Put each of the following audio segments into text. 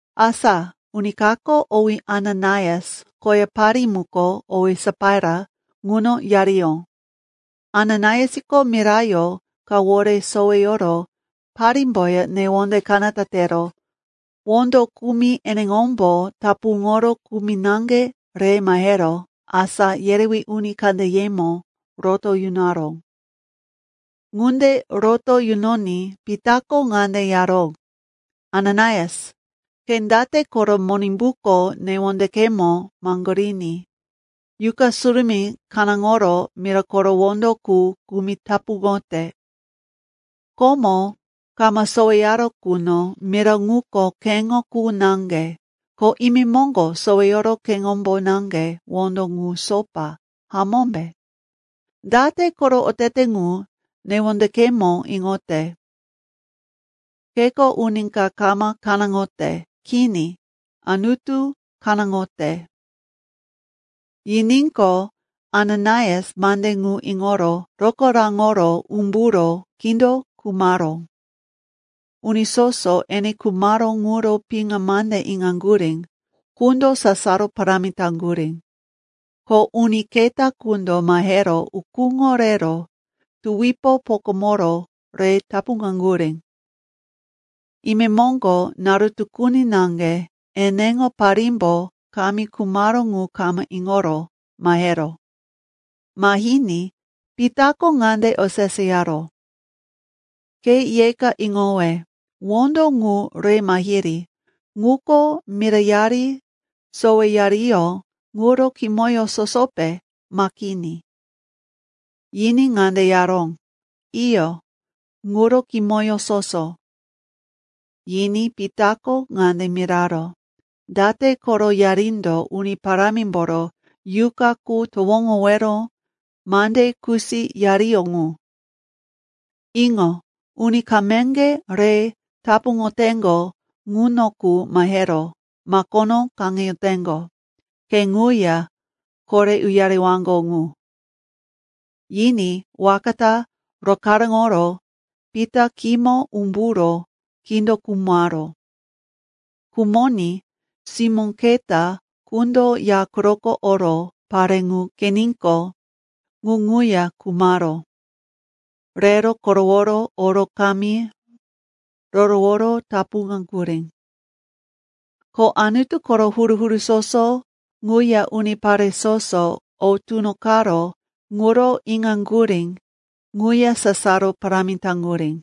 Asa uni kako, owí Ananaias, koya parí muko, owí Sapaira, ŋuno yariyó. Ananaiasko mirayó kawore soweyoro parímboya newonde kanata tero wondo kumi eneŋombo tapuŋoro kumi naŋge re mahero asá yerewí uni kandeyemo roto yunaró. Ŋunde roto yunoní Pitako ŋande yaró, “Ananaias, ke date koro Monimbuko newondekemo maŋgoriní Yuqa Surumí kanáŋoro mira koro wondo qu kumi tapuŋote? Komo, kama soweyaró quno, mira ŋuko keŋo qu naŋge, ko imemoŋgo soweyoro keŋombo naŋge wondo ŋu sopa, hamómbe? Date koro otete ŋu newondekemo iŋote? Keko uni ka kama kanáŋote. Kini, Anutu kanáŋote.” Yiníqo, Ananaias mande ŋu iŋoro rokaráŋoro umburo kindo khumaró. Uni soso ene khumaró ŋuro piŋa mande iŋaŋgurí qundo sasaro parámi taŋgurí. Ko uni keta qundo mahero ukúŋo rero tuwipo pokamoro re tapuŋaŋgurí. Imemoŋgo naru tukuni naŋge eneŋo parímbo kamí khumaró ŋu kama iŋoro maheró. Mahiní Pitako ŋande oseseyaró, “Ke yeka iŋowe. Wondo ŋu re mahiri, ŋuko mirayari soweyariyó ŋuro kimoyó sosope, ma kini?” Yiní ŋande yaró, “Iyo, ŋuro kimoyó soso.” Yiní Pitako ŋande miraró, “Date koro yarindo Uni Parámimboro Yuqa qu towoŋowero mande kusiyariyó ŋu? Iŋo, uni kameŋge re tapuŋoteŋgo ŋuno qu mahero makono kaŋeyoteŋgo. Ke ŋuya kore uyarewaŋgo ŋu.” Yiní waka ta rokaráŋoro Pita khímo umburo kindo khumaró. Khumoní simó keta qundo ya quroko oro pare ŋu qeniqo, ŋu ŋuya khumaró. Rero koroworo oro kamí roroworo tapuŋaŋgurí. Ko Anutu koro huru-huru soso ŋuya unipare soso o tunoqaró ŋuro iŋaŋgurí ŋuya sasaro parámi taŋgurí.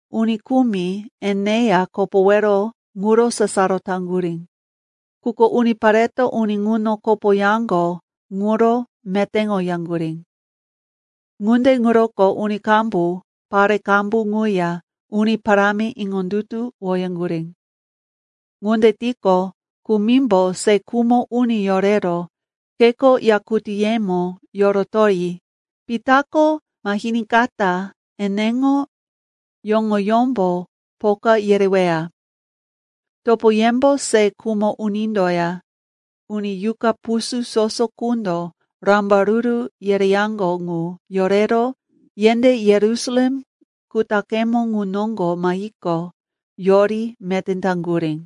Uni kumi eneya kopowero ŋuro sasaro taŋgurí, quko unipareto uni ŋuno kopoyaŋgo ŋuro metéŋoyaŋgurí. Ŋunde ŋuroko uni qambu, pare qambu ŋuya Uni Parámi iŋondutuwoyaŋgurí. Ŋunde tiqo, kumimbo se khumo uni yorero kheko yakutíyemo yorotoyi Pitako mahiníkata eneŋo yoŋoyómbo poka yereweya. Topoyembo se khumo unindoya uni yuqa pusú soso qundo rambaruru yereyaŋgo ŋu yorero yendé Yerusalem kutaqemo ŋu noŋgo mahiqo, yori meté taŋgurí.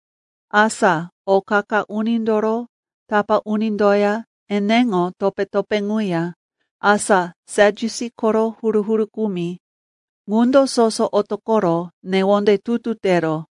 Asa o qa-qa unindoro tapá unindoya eneŋo topé-topé ŋuya, asa Sadyusi koro huru-huru kumi, ŋundo soso otoqoro newonde tutu tero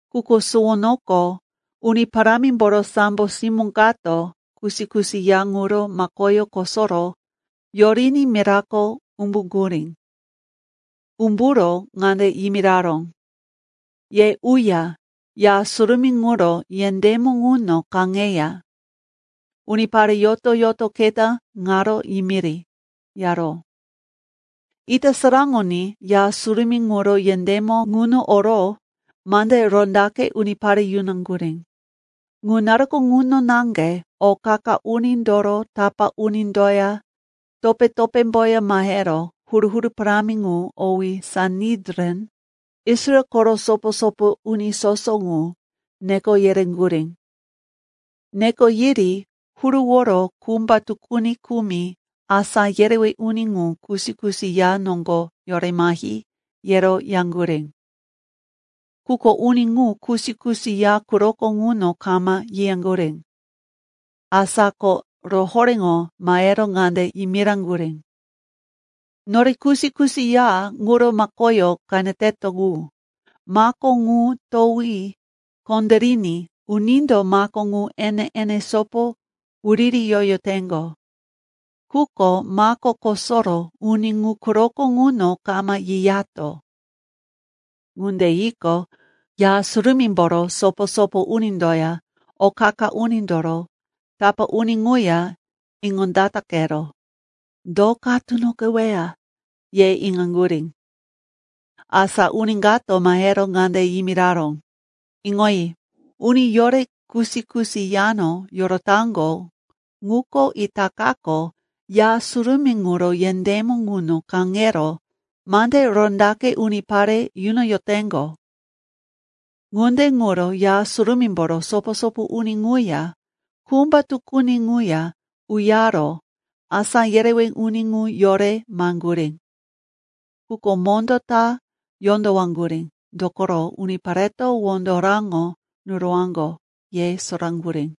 Quko suwonoko Uni Parámimboro sambo simó kato kusi-kusi ya ŋuro makoyó kosoro yoriní mirako umbuŋgurí. Umburo ŋande yimiraró, “Ye uya Ya Surumí ŋuro yendémo ŋuno kaŋeya unipare yoto-yoto keta ŋaro yimiri,” yaró. Ita saraŋoní Ya Surumí ŋuro yendémo ŋuno oro mande rondaqe unipare yunaŋgurí. Ŋu naruko ŋuno naŋge o qa-qa unindoro tapá unindoya topé-topémboya mahero huru-huru parámi ŋu owí Sanedrin, Israel koro sopo-sopo uni soso ŋu, neko yereŋgurí. Neko yiri huruworo kumba tukuni kumi asá yerewí uni ŋu kusi-kusi ya noŋgo yore mahi, yero yaŋgurí. Quko uni ŋu kusi-kusi ya quroko ŋuno kama yiyaŋgurí. Asa ko rohoréŋo mahero ŋande yimiraŋgurí, “Nore kusi-kusi ya ŋuro makoyó qeneteto ŋu, mako ŋu towi kondériní unindo mako ŋu ene-ene sopo wuririyoyoteŋgo. Quko mako kosoro uni ŋu quroko ŋuno kama yiyato.” Ŋunde yiqo, Ya Surumímboro sopo-sopo unindoya o qa-qa unindoro tapá uni ŋuya iŋondataqero, “Do ka tunoqeweya?” ye iŋaŋgurí. Asa uni kato mahero ŋande yimiraró, “Iŋoyi, uni yore kusi-kusi yano yorotaŋgo ŋuko itakako Ya Surumí ŋuro yendémo ŋuno kaŋero mande rondaqe unipare yunoyoteŋgo.” Ŋunde ŋuro Ya Surumímboro sopo-sopo uni ŋuya kumba tukuni ŋuya uyaro asá yerewí uni ŋu yore maheŋgurí. Quko mondó ta yondowaŋgurí, dokoro unipareto wondo raŋo nurowaŋgo, ye soraŋgurí.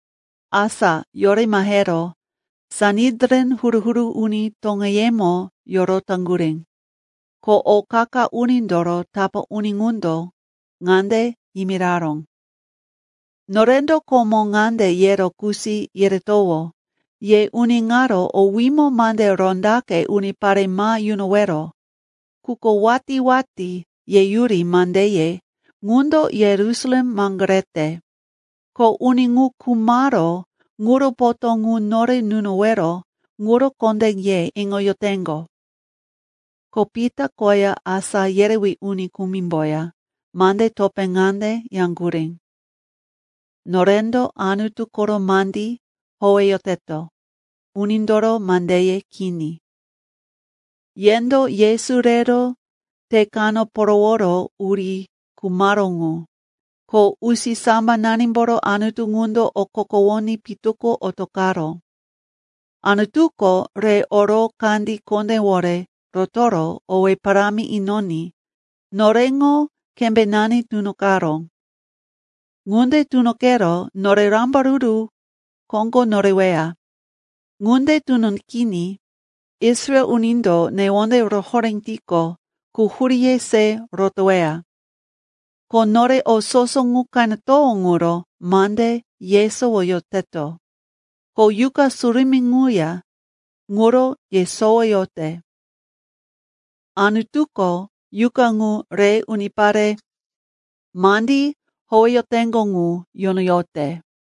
Asa yore mahero Sanedrin huru-huru uni toŋeyemo yorotaŋgurí. Ko o qa-qa unindoro tapá uni ŋundo ŋande yimiraró, “Norendo komo ŋande yero kusi yeretowó, ye uni ŋaro owímo mande rondaqe unipare ma yunowero. Quko watí-watí yeyuri mandeye ŋundo Yerusalem maŋgorete. Ko uni ŋu khumaró ŋuro potó ŋu nore nunowero ŋuro kondé ye iŋoyoteŋgo.” Ko Pita koya asá yerewí uni kumimboya mande topé ŋande yaŋgurí, “Norendo Anutu koro mandí howeyoteto, unindoro mandeye kini. Yendo Yesu rero te kano poroworo uri khumaró ŋu. Ko usisambananimboro Anutu ŋundo okokowoní pitu ko otoqaró. Anutuko re oro kandí kondéwore rotoro owé parámi inoní noreŋo kembénani tunoqaró. Ŋunde tunoqero nore rambaruru koŋgo noreweya. Ŋunde tunoqiní Israel unindo newonde rohoré tiqo, quhuríye se rotoweya. Ko nore o soso ŋu qenetowó ŋuro mande yesowoyoteto. Ko Yuqa Surumí ŋuya ŋuro yesowoyote. Anutuko Yuqa ŋu re unipare mandí howeyoteŋgo ŋu yunoyote.”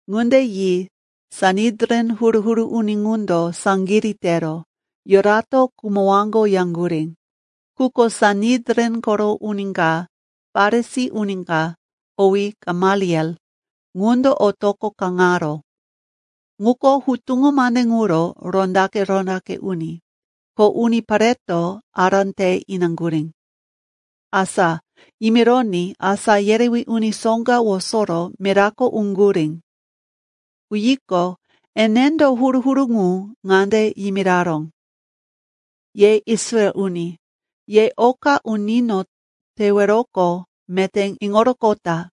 Ŋunde yi Sanedrin huru-huru uni ŋundo saŋgirí tero yurato khumowaŋgo yaŋgurí. Quko Sanedrin koro uni ka, Farisi uni ka, owí Gamaliel, ŋundo otoqo kaŋaró. Ŋuko hutuŋo mande ŋuro rondaqe-rondaqe uni, ko unipareto ará te inaŋgurí. Asa yimironí asá yerewí uni soŋga wosoro mirako uŋgurí. Uyiqo, enendo huru-huru ŋu ŋande yimiraró, “Ye Israel uni, ye oka unino teweroqo meté iŋoroqota.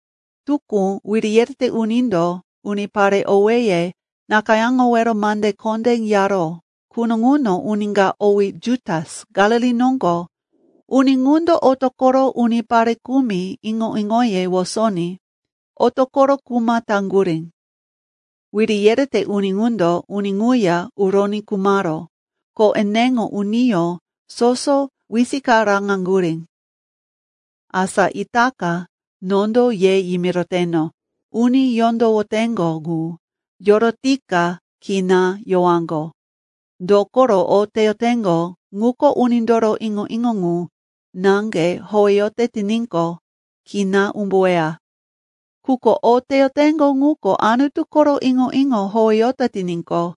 Tukú wiri yerete unindo unipare owéye nakayáŋowero mande kondé yaró quno, ŋuno uni ka owí Jutas, Galili noŋgo uni ŋundo otoqoro unipare kumi iŋo-iŋoye wosoní otoqoro kuma taŋgurí. Wiri yerete uni ŋundo uni ŋuya uroní khumaró, ko eneŋo uniyó soso wisikaraŋaŋgurí. Asa itaka nondo ye yimiroteno, uni yondowoteŋgo ŋu yorotika kina yowaŋgo. Dokoro o teyoteŋgo ŋuko unindoro iŋo-iŋo ŋu naŋge howeyote tiníqo, kina umbuweya. Quko o teyoteŋgo ŋuko Anutu koro iŋo-iŋo howeyote tiníqo,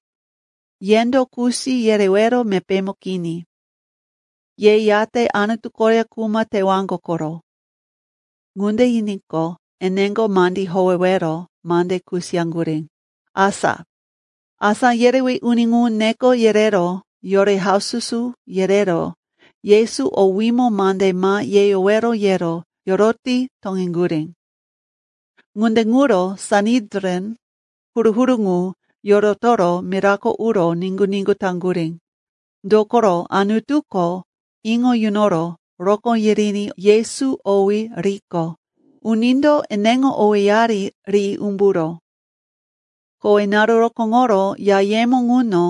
yendo kusi yerewero mepémo kini. Ye yate Anutu koya kuma tewaŋgo koro.” Ŋunde yiníqo, eneŋo mandí howewero mande kusiyaŋgurí. Asa asá yerewí uni ŋu neko yerero yore haususu yerero Yesu owímo mande ma yeyowero yero yoroti toŋeŋgurí. Ŋunde ŋuro Sanedrin huru-huru ŋu yorotoro mirako uro niŋgu-niŋgu taŋgurí. Dokoro Anutuko iŋo yunoro rokó yiriní Yesu owí riqo, unindo eneŋo owéyari ri umburó. Kowe naru rokóŋoro yayemo ŋuno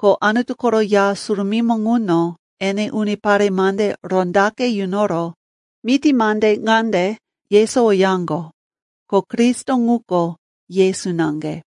ko Anutu koro Ya Surumímo ŋuno ene unipare mande rondaqe yunoro miti mande ŋande yesowoyaŋgo, ko Kristo ŋuko Yesu naŋge.